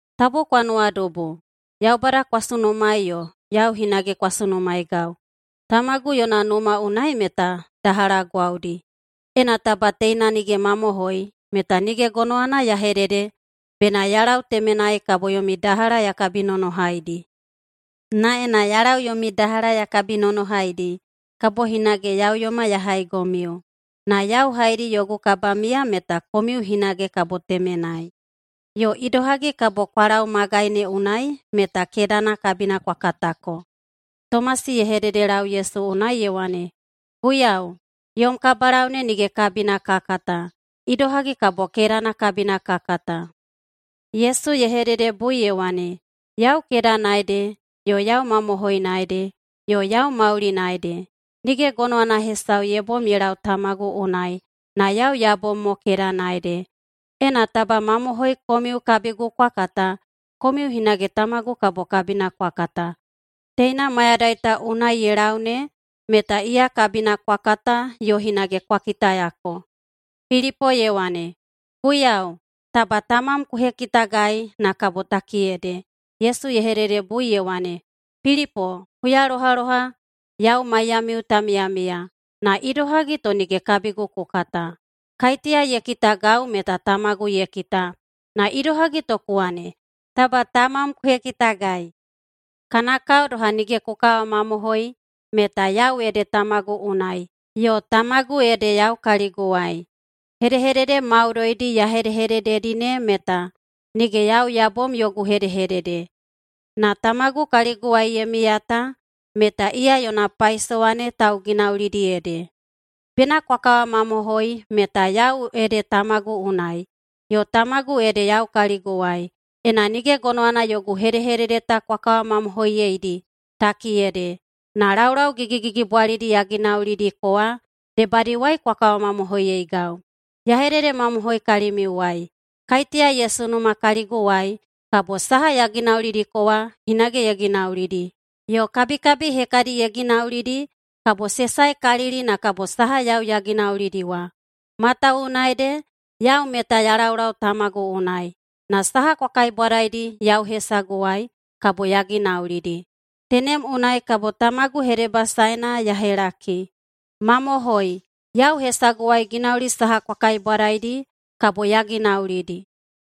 “Tabu kwa nuwadubu, Yaubada kwa sunumaei yo yau hinage kwa sunumaeigau. Tamagu yona numa unai meta dahala gwaudi. Ena taba teina ta nige mamohoi, meta nige gonowana ya hedede bena ya lau temenai kabo yomi dahala ya kabinonohaidi. Na ena ya lau yomi dahala ya kabinonohaidi, kabo hinage ya uyoma ya haigomiu, na yau haedi yogu kabamiya meta komiu hinage kabo temenai. Yo idohagi kabo kwa lau magaina ne unai meta kedana kabina kwa katako.” Tomasi ye hededelau Yesu unai ye wane, “Guiyau, yom kabalau ne nige kabina ka kata. Idohagi kabo kedana kabina ka kata?” Yesu ye hededebui ye wane, “Yau kedana ede, yo yau mamohoina ede, yo yau maulina ede. Nige gonowana hesau ye bom ye lau Tamagu unai, na yau ya bom mo kedana ede. Ena taba mamohoi komiu kabigu kwa kata, komiu hinage tamagu kabo kabina kwa kata. Teina mayadai ta unai ye lau ne meta iya kabina kwa kata yo hinage kwa kitayako.” Pilipo ye wane, “Guiyau, taba tamam ku hekitagai, na kabo takiyede.” Yesu ye hededebui ye wane, “Pilipo, huyalohaloha yau maiyamiu ta miyamiya. Na idohagi to nige kabigu ku kata? Kaiteya ye kitagau meta Tamagu ye kita. Na idohagi to ku wane, ‘Taba tamam ku hekitagai’? Kana kao doha nige ku kawamamohoi meta yau ede Tamagu unai, yo Tamagu ede yau kaliguwai. Hedehedede maudoidi ya hedehedededi ne meta nige yau ya bom yogu hedehedede, na Tamagu kaliguwai ye miya ta meta iya yona paisowa ne tauginaulidi ede. Bena kwa kawamamohoi meta yau ede Tamagu unai, yo Tamagu ede yau kaliguwai. Ena nige gonowana yogu hedehedede ta kwa kawamamohoiyeidi, takiyede, na laulau gigigigibwalidi ya ginaulidiko wa debadiwai kwa kawamamohoiyeigau. Ya hededemamohoi kalimiuwai: Kaiteya ye sunuma kaliguwai kabo saha ya ginaulidiko wa hinage ye ginaulidi. Yo kabikabi hekadi ye ginaulidi kabo se saekalili na kabo saha yau ya ginaulidi wa. Matawuwuna ede yau meta ya laulau Tamagu unai. Na saha kwa kaibwadaidi yau hesaguwai, kabo ya ginaulidi. Tenem unai kabo Tamagu hedebasaena ya helaki. Mamohoi, yau hesaguwai ginauli saha kwa kaibwadaidi, kabo ya ginaulidi.”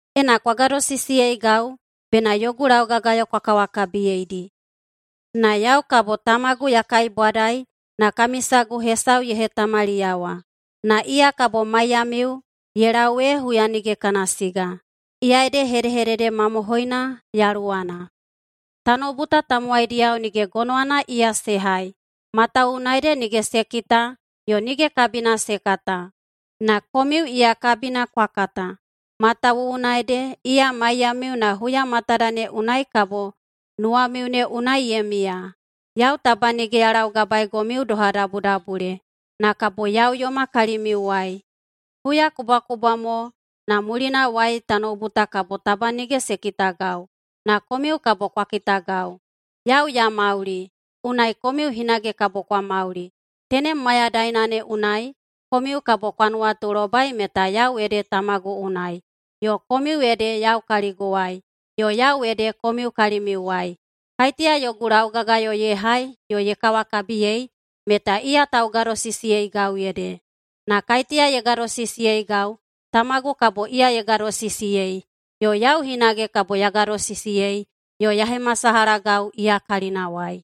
“Ena kwa gadosisiyeigau, bena yogu laugagayo kwa kawakabiyeidi. Na yau kabo Tamagu ya kaibwadai na kami sagu hesau ye hetamaliyawa, na iya kabo maiyamiu ye lau ee huya nige kana siga. Iya ede hedehedede mamohoina Yaluwana. Tanoubu ta tamowaidiyao nige gonowana iya se hai, matawuwuna ede nige se kita yo nige kabina se kata. Na komiu iya kabina kwa kata, matawuwuna ede iya maiyamiu na huya matada ne unai kabo nuwamiu ne unai ye miya. Yau taba nige ya laugabaegomiu doha dabudabule, na kabo ya uyoma kalimiuwai. Huyakubwakubwa mo na mulinawai tanoubu ta kabo taba nige se kitagau, na komiu kabo kwa kitagau. Yau ya mauli, unai komiu hinage kabo kwa mauli. Tenem mayadaina ne unai komiu kabo kwa nuwatulobai meta yau ede Tamagu unai, yo komiu ede yau kaliguwai, yo yau ede komiu kalimiuwai. Kaiteya yogu laugagayo ye hai yo ye kawakabiyei meta iya taugadosisiyeigau ede. Na kaiteya ye gadosisiyeigau, Tamagu kabo iya ye gadosisiyei, yo yau hinage kabo ya gadosisiyei yo ya hemasalahagau iya kalinawai.”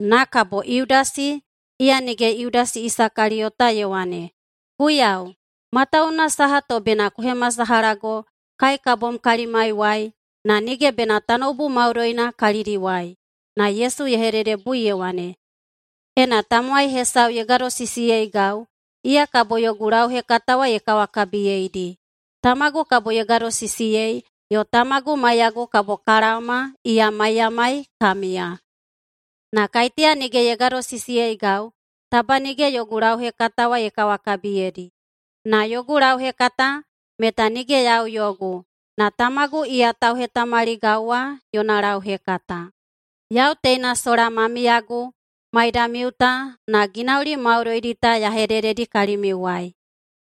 Na kabo Yudasi (iya nige Yudasi Isakaliyota) ye wane, “Guiyau, matawuwuna saha to bena ku hemasalahago kai ka bom kalimaiwai na nige bena tanoubu maudoina kalidiwai?” Na Yesu ye hededebui ye wane, “Ena tamowai hesau ye gadosisiyeigau, iya kabo yogu lauhekata wa ye kawakabiyeidi. Tamagu kabo ye gadosisiyei, yo Tamagu maiyagu kabo ka laoma iya maiyamai ka miya. Na kaiteya nige ye gadosisiyeigau, taba nige yogu lauhekata wa ye kawakabiyedi. Na yogu lauhekata meta nige yau yogu, na Tamagu iya tauhetamaligau wa yona lauhekata. Yau teina sola ma miyagu maidamiu ta na ginauli maudoidi ta ya hedededi kalimiuwai.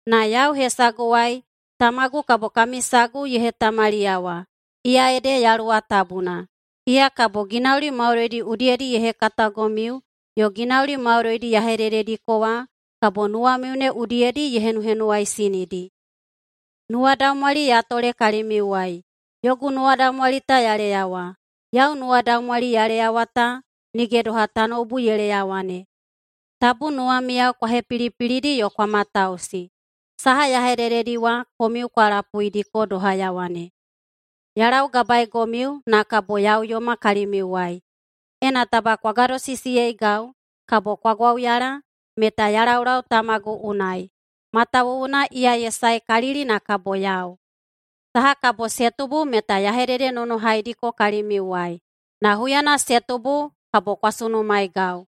Na yau hesaguwai Tamagu kabo kami sagu ye hetamaliyawa. Iya ede Yaluwa Tabuna. Iya kabo ginauli maudoidi udiyedi ye hekatagomiu yo ginauli maudoidi ya hededediko wa kabo nuwamiu ne udiyedi ye henuhenuwaisinidi. Nuwadaumwali ya tole kalimiuwai, yogu nuwadaumwali ta ya leyawa. Yau nuwadaumwali ya leyawa ta nige doha tanoubu ye leyawa ne. Tabu nuwamiyao kwa hepilipilidi yo kwa matausi. Saha ya hedededi wa komiu kwa lapuidiko doha ya wane, ‘Ya laugabaegomiu, na kabo ya uyoma kalimiuwai.’ Ena taba kwa gadosisiyeigau, kabo kwa gwauyala meta ya laulau Tamagu unai, matawuwuna iya ye saekalili na kabo yau. Saha kabo se tubu meta ya hededenonohaidiko kalimiuwai. Na huyana se tubu kabo kwa sunumaeigau.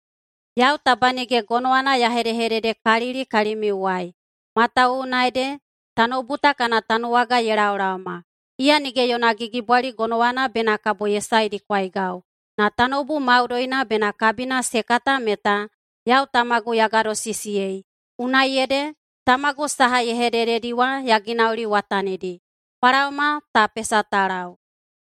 Yau taba nige gonowana ya hedehededekalili kalimiuwai, matawuwuna ede tanoubu ta kana tanuwaga ye laolaoma. Iya nige yona gigibwali gonowana bena kabo ye saedikwaigau. Na tanoubu maudoina bena kabina se kata meta yau Tamagu ya gadosisiyei, unai ede Tamagu saha ye hedededi wa ya ginauliwatanidi. Kwa laoma, ta pesa ta lau.”